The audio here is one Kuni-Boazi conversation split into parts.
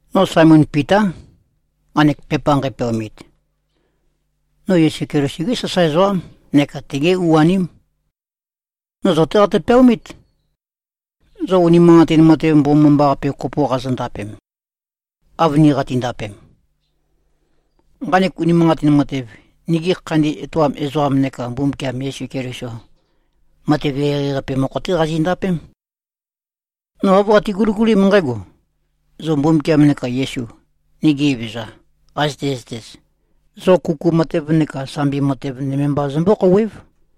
No Saemon Pitá, nqanek pepa nqæpeaomit. No Yesu Keliso-gé sasae ezoqám neka tegé u-aném. No zo-té qatø-peaomít, zo unimanqatin matev mbomambaqape kopo qazondapem, av ni qatindapem. Nqanek unimanqatin matev, nigi khandi etoam ezoqam neka Mbumbukiam Yesu Keliso-qa matev eqeieqei-qape mokho-té qazindapém. No āv qate-guligulím nqǽgo: Zo Mbumbukiam neka Yesu, nigi Evezøza, qazøte-zøtez, zo kuku matev neka sambi matev nøme mba zømbó-khouwév.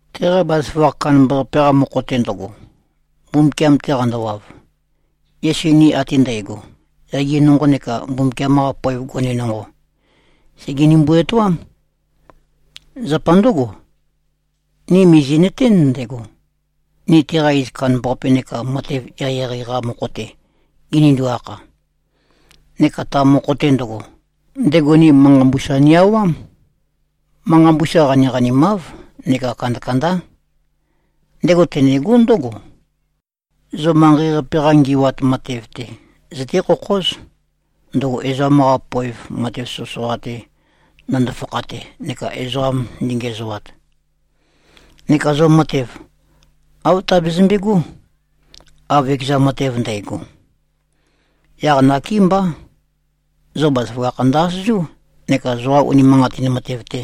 Teqa bazaføgakh kandambaqape-qa mokho-te ndøgo, Mbumbukiam-te qandowav, Yesu ni ate ndægo, yage nonqo neka Mbumbukiam-qa poev gone nonqo, sègenimbu-etoám. Zapa ndǿgo, ni mìzi꞉nøtén ndego, ni teqa iz kandambaqape neka matev eqeieqei-qa mokho-te ginindu-akha. Neka ta mokho-te ndøgo, ndego ni manqa mbusa ni-aumám. Manqa mbusa qaniqanimáv neka kandakandá. Ndego tenegó ndǿgo: Zo manqei-qape-qa ngi꞉wat matev-te zøté-khokhóz, ndøgo ezoqam-qa poev matev soqøsoqa-te ndøndo-fakhate neka ezoqa ndøngiæzoat. Neka zo matev, āv tabezømbe꞉gó, av ekeza matev ndægo. Yaq nakémbá, zo bazaføgakh ndø-asøzú neka zoqa unimanqatin matev-te,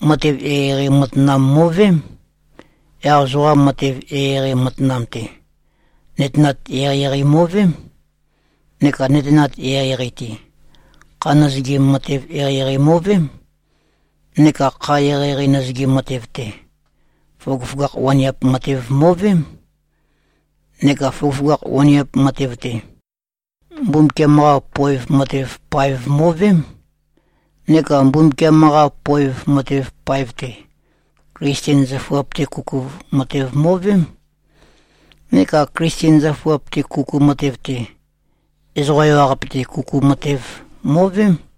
matev eqeieqei matanam mo꞉veém. Yaq zoqa matev eqeieqei matanam-te, nøtenat eqeieqei mo꞉veém. Neka nøtenat eqeieqei-te, kha nøzøgim matev eqeieqei mo꞉veém. Neka kha eqeieqei nøzøgim matev-te, føgøføgakh waniap matev mo꞉veém. Neka føgøføgakh waniap matev-te, Mbumbukiam-qa poev matev paev mo꞉veém. Neka Mbumbukiam-qa poev matev paev-te, Klisten zøfuap-te kuku matev mo꞉veém. Neka Klisten zøfuap-te kuku matev-te, ezoqa ewaqape-te kuku matev mo꞉veém.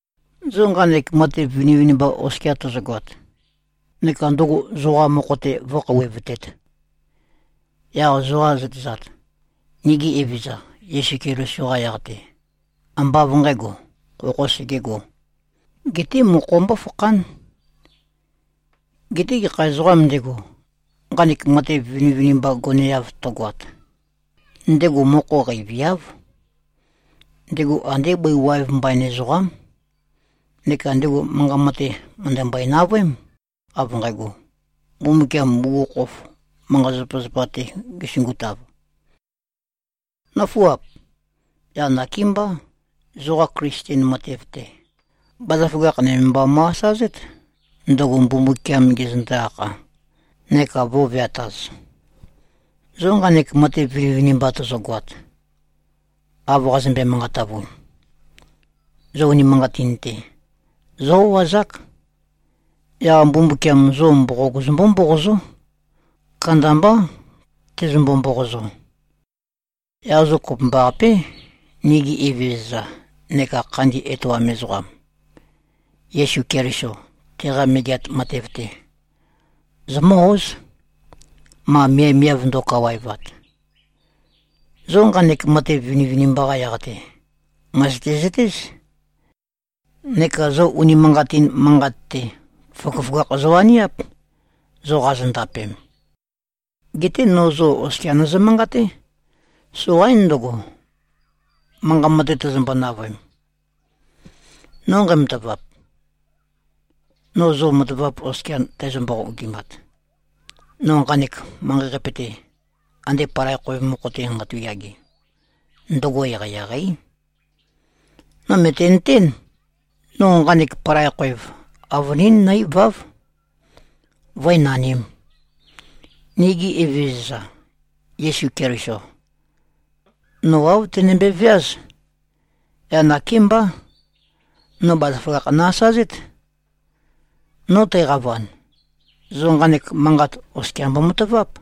Zo nqanek matev vinivinimba oskia tozogoat, neka ndøgo zoqa mokho-te vǿkhouwevtēt, yaq zoqa zøtezat, nigi Evezøza Yesu Keliso-qa yaq-te, ambá av nqǣgo, khokhō segegō, geté mokho mbófakhán. Geté gekha ezoqām ndego, nqanek matev vinivinimba goneav tøgoat, ndego mokho qeiviáv. Ndego andé bøi waev mbain ezoqám, neka ndego manqa mate mø̀ndømbøe-navøém, av nqægo, Mbumbukiam bugukhokhof manqa-zapazapa-te gesungutav. Nǿfuap! Yaq nakémbá, zoqa Klisten matev-te, bazaføgakh nøme mba mo꞉-asazét, ndøgo Mbumbukiam gezøndo-akha neka vø̄veataz. Zo nqanek matev vinivinimba tozogoat, av qazømbe-manqatavun, zo unimanqatin-te, zó-o꞉azák. Yaq Mbumbukiam zo mboqog zømbó-mboqozó. Kandambá, tezømbo-mboqozo. Yaq zo kopømbaqapé, nigi Evezøza neka Khandi Etoam Ezoqam, Yesu Keliso, teqa megeat matev-te, zomǿ-óz, ma miavmiav ndo꞉kawaevat. Zo nqanek matev vinivinimba-qa yaq-te, mø̀zøte-zøtéz, neka zo unimanqatin manqat-te, føgøføgakh zowaniáp, zo qazondapem. Geté no zo oskia nøzø-manqaté. Soqaín ndøgo, manqa mate tøzømbo-navøem. No nqæmatavap, no zo matavap oskia tæzø-mboqogimat, no nqanek manqei-qape-te, ande palai khoev mokho-te nqatu꞉-yage, ndøgo eqeieqeí. No mø̀tenøtén, no nqanek palai khoev avønín nǿ-iváv, vǿe-nanīm. Nigi Evezøza, Yesu Keliso, no āv tenømbe-veáz. Yaq nakémbá, no bazaføgakh no-asazét. No tæqavan, zo nqanek manqat oskia mbomataváp.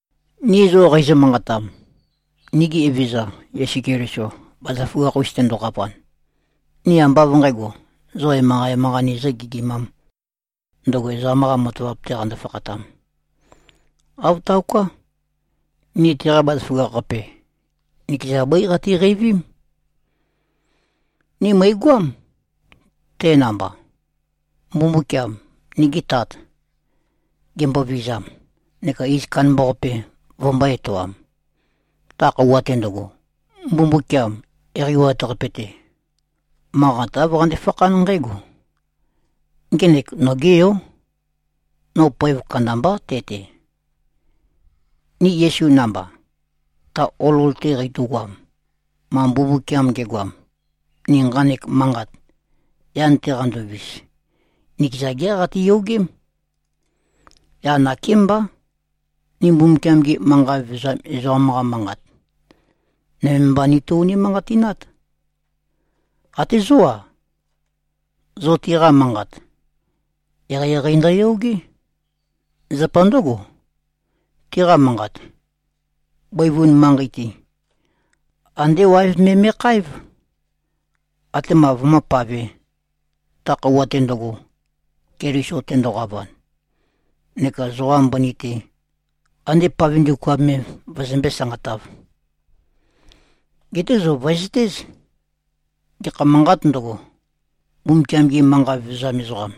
Ni zo qeizø-manqatam, nigi Evezøza Yesu Keliso bazaføgakh-us tendoqavan, ni ambá av nqǣgo, zo emanqa-emanqa nizø-gɨgimām, ndøgo ezoqam-qa matavap-te qando-fakhatam. Āv taoká. Ni teqa bazaføgakh-qape, nikeza bøí qatiqeivím. Ni mø̀igøám, te namba, Mbumbukiam, nigi Tat, gembovizam neka iz kandambaqape vømbō-etoam. Ta khøuwa-te ndøgo, Mbumbukiam Eqeiwat-Qape-te, manqat āv qande-fakhán nqǽgo, “Ngenek nogé Yó. No poev kandambá te-te.” Ni Yesu namba, ta olol-te qeitogoam, ma Mbumbukiam ge꞉goam, ni nqanek manqat, yan-te qandovis, nikeza geá qatiyogém. Yaq nakémbá, ni Mbumbukiam-gi manqa vevezam ezoqam-qa manqat, nøme mba nito-unimanqatinát. Até zó-a, zo tiqa manqat, eqeieqei ndøyogé. Zapa ndǿgo, tiqa manqat, bøivun manqei-te, andé waev me me꞉khaév, atema vømǿpavē, ta khøuwa-te ndøgo, Keliso tendoqavan, neka zoqa mbøni-te, ande pave ndukuam me vøzømbé-sanqatāv. Geté zo vø̀ezøtéz. Gekha manqāt ndøgo, Mbumbukiam-gi manqa vevezam ezoqam,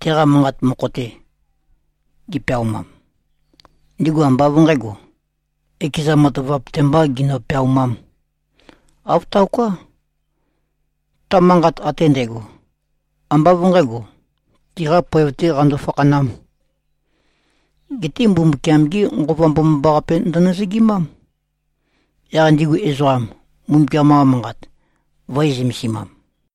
teqa manqat mokho-te gipeaumam, ndigu ambá av nqǣgo, ekeza matavap-te mbā ginø-peaumām. Āv taoká. Ta manqat ate ndægo, ambá av nqǣgo, tiqa poev-tē qando-fakhanām. Geté Mbumbukiam-gé Nqova Mbomambaqape ndønøzøgimám, yaq ndigu ezoqa Mbumbukiam-qa Manqat vø̄e-zømesimam.